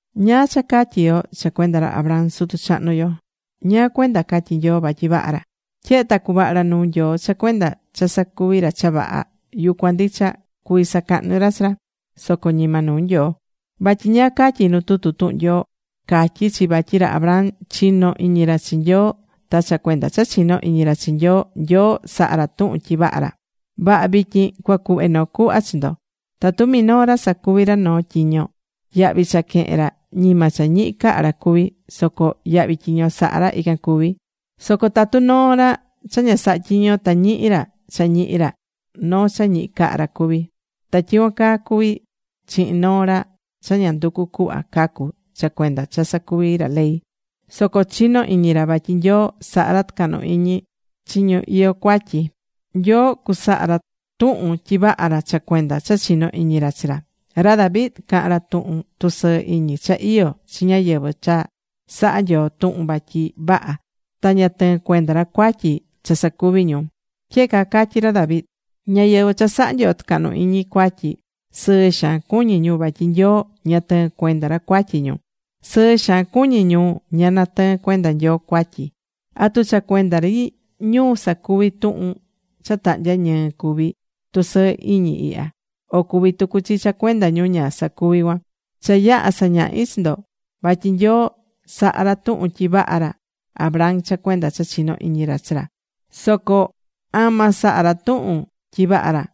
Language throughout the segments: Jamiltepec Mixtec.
¿Ñáá cha catyí yo cha cuenda ra Abraham sutu chahnu yo? ¿Ñáá cuenda catyí Nyoo vatyi vaha ra? Tyehe ta cuvaha̱ ra nuu Nyoo cha cuenda cha sacuvi̱ ra cha vaha, yucuan ndicha, cuví sacahnu ra chi ra, soco ñima nuu Nyoo. Vatyi ¿ñáá catyí nu tutu tuhun Nyoo? Catyí chi vatyi ra Abraham chino̱ iñi ra chi Nyoo, ta cha cuenda cha chinó iñi ra chi Nyoo, Nyoo saha̱ ra tuhun tyi vaha ra. Vaha, vityin cuacuhve noo cuhva chi ndo: Tatu minoo ra sacuví ra noo tyiño, yahvi cha quehén ra ñima cha ñihi caha ra cuví, soco yahvi tyiño saha̱ ra, ican cuví. Soco tatu noo ra cha ña saha tyiño ta ñihi ra cha ñihi ra, noo cha ñihi caha ra cuví. Ta tyicuan caa cuví chihin noo ra cha ña nducu cuhva cacu cha cuenda cha sacuví ra ley, soco chinó iñi ra vatyi Nyoo sahá ra tucahnu iñi chi ñu iyó cuatyi, Nyoo cusaha ra tuhun tyi vaha ra cha cuenda cha chinó iñi ra chi ra. Ra David caha̱n ra tuhun tusɨɨ iñi cha iyó chi ñáyɨvɨ cha saha̱ Nyoo tuhun vatyi vaha ta ña tɨɨ́n cuenda ra cuatyi cha sacuvi̱ ñu. Tyehe caa catyí ra David: Ñáyɨvɨ cha saha̱ Nyoo tucahnu iñi cuatyi, sɨɨ xaan cuñí ñu, vatyi Nyoo ña tɨɨ́n cuenda ra cuatyi ñu. Sɨɨ xaan cuñí ñu ña tɨɨn cuenda Nyoo cuatyi. ¿Atu cha cuenda ri ñu sacuvi̱ tuhun cha tahnya ñɨɨ cuví tusɨɨ iñi ihya, o cuví tucu chi cha cuenda ñu ña sacuvi̱ cuan? Cha yaha̱ sañahi chi ndo vatyi Nyoo saha̱ ra tuhun tyi vaha ra Abraham cha cuenda cha chinó iñi ra chi ra. Soco ¿ama saha̱ ra tuhun tyi vaha ra?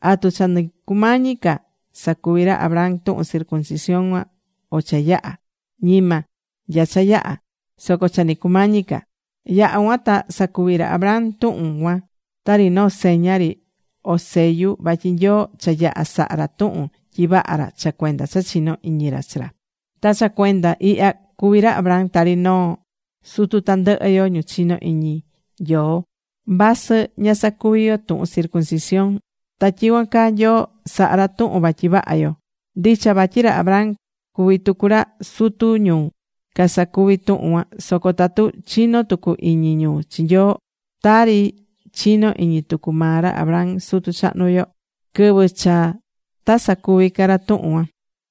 ¿Atu cha nɨ cumañi ca sacuvi ra Abraham tuhun circuncisión cuan, o cha yaha̱? Ñima nya cha yaha̱, soco cha nɨ cumañi ca. Yaha̱ cuan ta sacuvi̱ ra Abraham tuhun cuan, tari noo seña ri o sellu vatyi Nyoo cha yaha̱ saha̱ ra tuhun tyi vaha ra cha cuenda cha chinó iñi ra chi ra. Ta cha cuenda ihya cuví ra Abraham tari noo sutu tandɨhɨ yo ñu chinó iñi Nyoo vasɨ ña sacuvi̱ yo tuhun circuncisión. Ta tyicuan caa, Nyoo sahá ra tuhun vatyi vaha yo. Ndicha vatyi ra Abraham cuví tucu ra sutu ñu casacuví tuhun cuan, soco tatu chinó tucu iñi ñu chi Nyoo tari chinó iñi tucu maa ra Abraham sutu chahnu yo, quɨvɨ cha ta sacuvi ca ra tuhun cuan.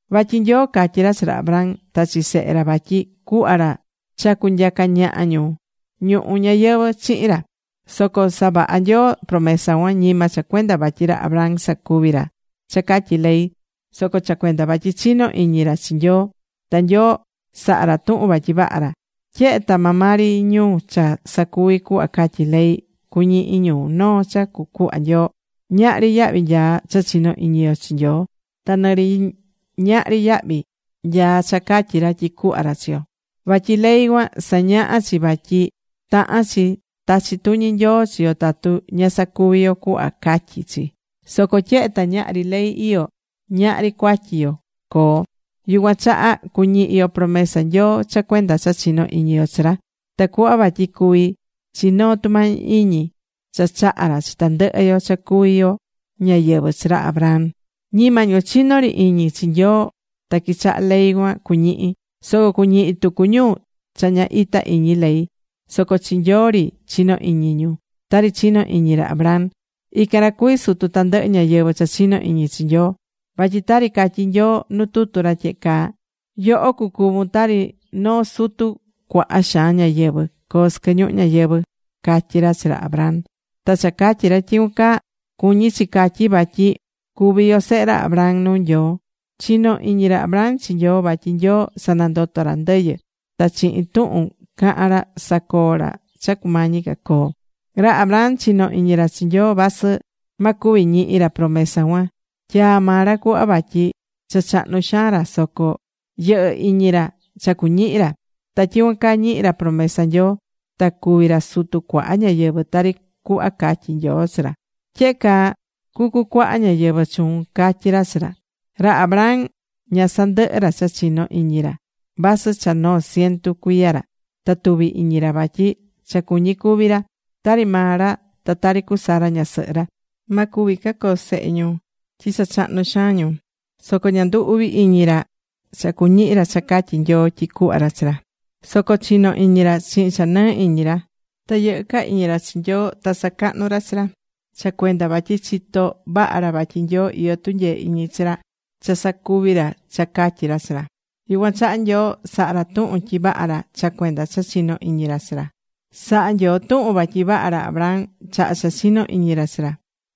Vatyi Nyoo catyi̱ ra chi ra Abraham ta chi sehe ra vatyi cuhva ra cha cunyaca ñaha ñu ñuhu ñayɨvɨ̱ chihin ra. Soco savaha̱ Nyoo promesa cuan, ñima cha cuenda vatyi ra Abraham sacuvi̱ ra cha catyí ley, soco cha cuenda vatyi chinó iñi ra chi Nyoo, ta Nyoo saha̱ ra tuhun vatyi vaha ra. Tyehe ta maa maa ri ñu cha sacuví cuhva catyí ley, cuñihi ñu noo cha cucuhva Nyoo, ñahri yahvi nyaá cha chinó iñi yo chi Nyoo, ta nɨ ñahri yahvi nyaá cha catyí ra tyi cuhva ra chiyo. Vatyi ley cuan sañahá chi vatyi tahán chi tachi tuñi Nyoo chi yo tatu ña sacuví yo cuhva catyí chi. Soco tyehe ta ñahri ley iyó, ñahri cuatyi yo coo. Yucuan chaha cuñihi yo promesa Nyoo cha cuenda cha chinó iñi yo chi ra, tacuhva vatyi cuvi chi noo tumañi iñi cha chahá ra chi tandɨhɨ yo cha cuví yo ñáyɨvɨ chi ra Abraham. Ñima ñu chinó ri iñi chi Nyoo ta quichahá ley cuan cuñihi, soco cuñihi tucu ñu cha ña ita iñi ley, soco chi Nyoo ri chinó iñi ñu tari chinó iñi ra Abraham. Ican ra cuví sutu tandɨhɨ ñáyɨvɨ cha chinó iñi chi Nyoo. Vatyi tari catyí Nyoo nu tutu ra tyehe caa: “¿Yoho cucuvun tari noo sutu cuaha xaan ñáyɨvɨ?", coo sɨquɨ ñuhu ñayɨvɨ̱”, catyí ra chi ra Abraham. Ta cha catyí ra tyicuan caa, cuñí chi catyi vatyi cuví yo sehe ra Abraham nuu Nyoo. Chinó iñi ra Abraham chi Nyoo, vatyi Nyoo sanandotó ra ndɨyɨ, ta chihin tuhun cahán ra sacoó ra cha cumañi ca coo. Ra Abraham chinó iñi ra chi Nyoo vasɨ ma cuvi ñihi ra promesa cuan tyaa̱ maa ra cuhva, vatyi cha chahnu xaan ra. Soco yɨhɨ́ iñi ra cha cuñihi ra. Ta tyicuan caa, ñihi̱ ra promesa Nyoo ta cuví ra sutu cuaha ñáyɨvɨ, tari cuhva catyi̱ Nyoo chi ra: “Tyehe caa cucucuaha ñáyɨvɨ chuun”, catyi̱ ra chi ra. Ra Abraham ña sandɨhɨ̱ ra cha chinó iñi ra, vasɨ cha noo cientu cuiya ra ta tuvi̱ iñi ra vatyi cha cuñí cúvi ra. Tari maa ra ta tari cu Sara ñasɨhɨ ra, ma cuvi ca coo sehe ñu, tyi cha chahnu xaan ñu. Soco ña ndu̱ uvi iñi ra cha cuñihi ra cha catyi̱ Nyoo tyi cuhva ra chi ra. Soco chinó iñi ra chihin cha nɨɨ iñi ra. Ta yɨhɨ́ ca iñi ra chi Nyoo. Ta sacahnú ra chi ra, cha cuenda vatyi chitó vaha ra vatyi Nyoo iyó tunyee iñi chi ra cha cusacuví ra cha catyí ra chi ra. Yucuan chaha Nyoo saha̱ ra tuhun tyi vaha ra cha cuenda cha chinó iñi ra chi ra. Saha̱ Nyoo tuhun vatyi vaha ra Abraham chaha cha chinó iñi ra chi ra.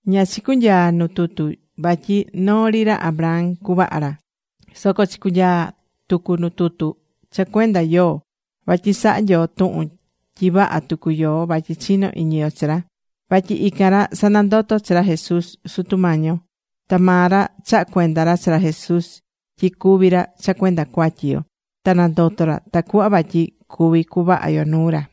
Ña chicunyaa̱ nuu tutu vatyi noo ri ra Abraham cuvaha ra, soco chicunyaa̱ tucu nuu tutu cha cuenda yoó. Vatyi sahá Nyoo tuhun tyi vaha tucu yo vatyi chinó iñi yo chi ra, vatyi ican ra sanandoto̱ chi ra Jesús, Sutu Mañi yo. Ta maa ra chaha̱ cuenda chi ra Jesús tyi cúvi ra cha cuenda cuatyi yo, ta nandoto̱ ra tacuhva vatyi cuvi cuvaha yo nuu ra.